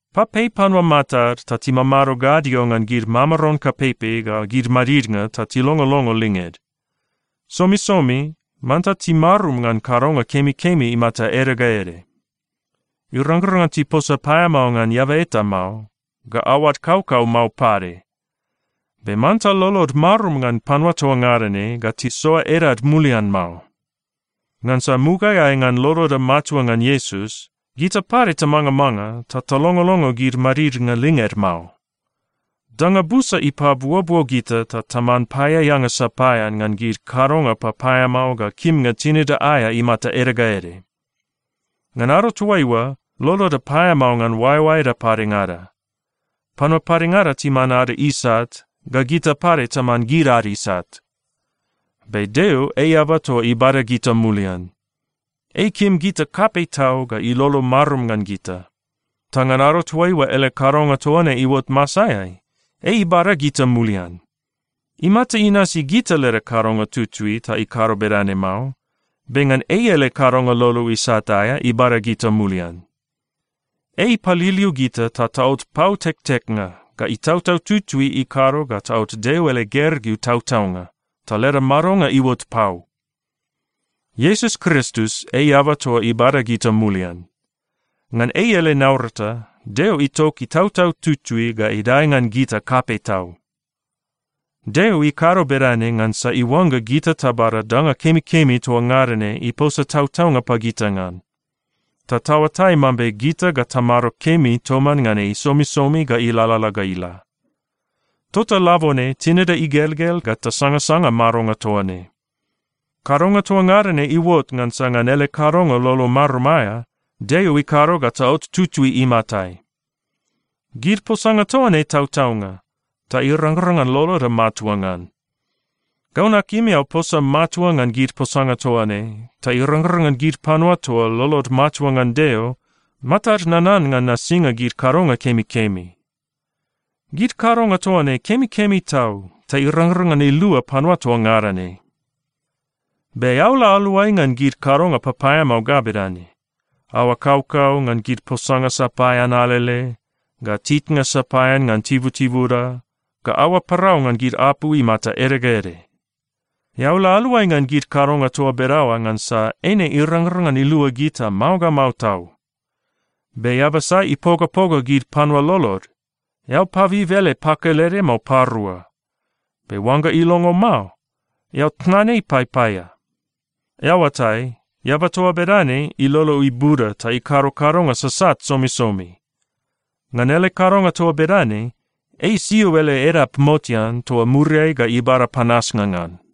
Papei panua matad ta timamado gadio ngan gid mamaron kapeipei ga gid madidnga ta tilongolongo linged. Somisomi manta timarum ngan kadonga kemikemi imata ede ga ede. Irangrang ngan tiposa paeamao ngan eaba eta mao, ga aoad kaukau mao pade. Be manta lolod marum ngan panua toa ngada ne ga tisoa edad mulian mao. Ngansa mugaeai ngan loloda matua ngan Iesus, gita pade tamangamanga ta talongolongo gid madidnga linged mao. Danga busa ipabuobuo gita ta taman paeaeanga sapaean ngan gid kadonga papaeamao ga kimnga tinida aea imata ede ga ede. Ngan ado toaiua, loloda paeamao ngan oaeoaeda padengada. Panua padengada timan ada isat, ga gita pade taman gid ad isat. Be Deo ei eaba toa ibada gita mulian. Ei ikim gita kapei tau ga ilolo marum ngan gita. Ta ngan ado toaiua ele kadonga toa ne iuot masaeai, ei ibada gita mulian. Imata inasi gita leda kadonga tutui ta ikado bedane mao, be ngan ei ele kadonga lolo isat aea ibada gita mulian. Ei ipaliliu gita ta taot pau tekteknga, ga Itautau Tutui ikado ga taot Deo ele gergeu tautaunga, ta leda madonga iuot pau. Iesus Kristus ei eaba toa ibada gita mulian. Ngan ei ele naurata, Deo itok Itautau Tutui ga idae ngan gita kapei tau. Deo ikado bedane ngansa iuangga gita tabada danga kemikemi toa ngada ne iposa tautaunga pagita ngan. Ta taoatai mambe gita ga tamado kemi toman ngan ei somisomi ga ilalala ga ila. Tota labone tinida igelgel ga tasangasanga madonga toa ne. Kadonga toa ngada ne iuot ngansa ngan ele kadonga lolo marum aea, Deo ikado ga taot tutui imatai. Gid posanga toa ne tautaunga, ta irangrang ngan loloda matua ngan. Gau nakim eao posa matua ngan gid posanga toa ne, ta irangrang ngan gid panua toa lolod matua ngan Deo, matad nanan ngan nasinga gid kadonga kemikemi. Gid kadonga toa ne kemikemi tau ta irangrang ngan ilua panua toa ngada ne. Be eao la aluai ngan gid kadonga papaeamao ga bedane: aoa kaukau ngan gid posanga sapaean alele, ga titnga sapaean ngan tibutibuda, ga aoa parau ngan gid apu imata ede ga ede. Eao la aluai ngan gid kadonga toa bedaoa ngansa eine irangrang ngan ilua gita mao ga mao tau. Be eaba sai ipogapoga gid panua lolod, eao pabib ele pakelede mao parua. Be oangga ilongo mao, eao tnan ei paipaia. Eao oatai, eaba toa bedane ilolo ibuda ta ikado kadonga sasat somisomi. Ngan ele kadonga toa bedane, ei isio ele edap motean toa muriai ga ibada panasnga ngan.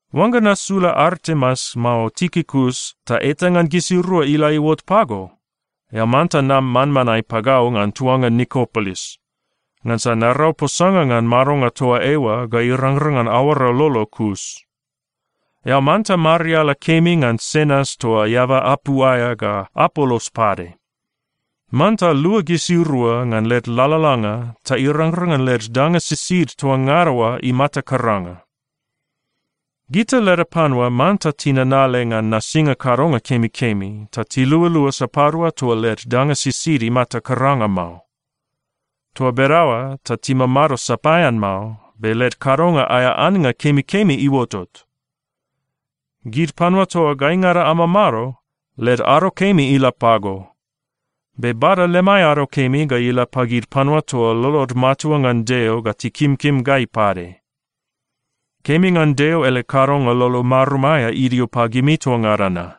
Oangga nasula Artemas mao Tikikus, ta eta ngan gisirua ila iuot pago, eao manta nam manmanae pagau ngan tuanga Nikopolis, ngansa narau posanga ngan madonga toa eoa ga irangrang ngan aoara lolo kus. Eao manta mariala kemi ngan Senas toa eaba apu aea ga Apolos pade. Manta lua gisirua ngan led lalalanga ta irangrang ngan led danga sisid toa ngada oa imata karanga. Gita leda panua manta tinanale ngan nasinga kadonga kemikemi ta tilualua sapadua toa led danga sisid imata karanga mao. Toa bedaoa ta timamado sapaean mao, be led kadonga aea annga kemikemi iuotot. Gid panua toa gaingada amamado, led ado kemi ila pago. Be bada lemai ado kemi ga ila pagid panua toa lolod matua ngan Deo ga tikimkim gai pade. Kemi ngan Deo ele kadonga lolo marum aea idio pagimi toa ngada na.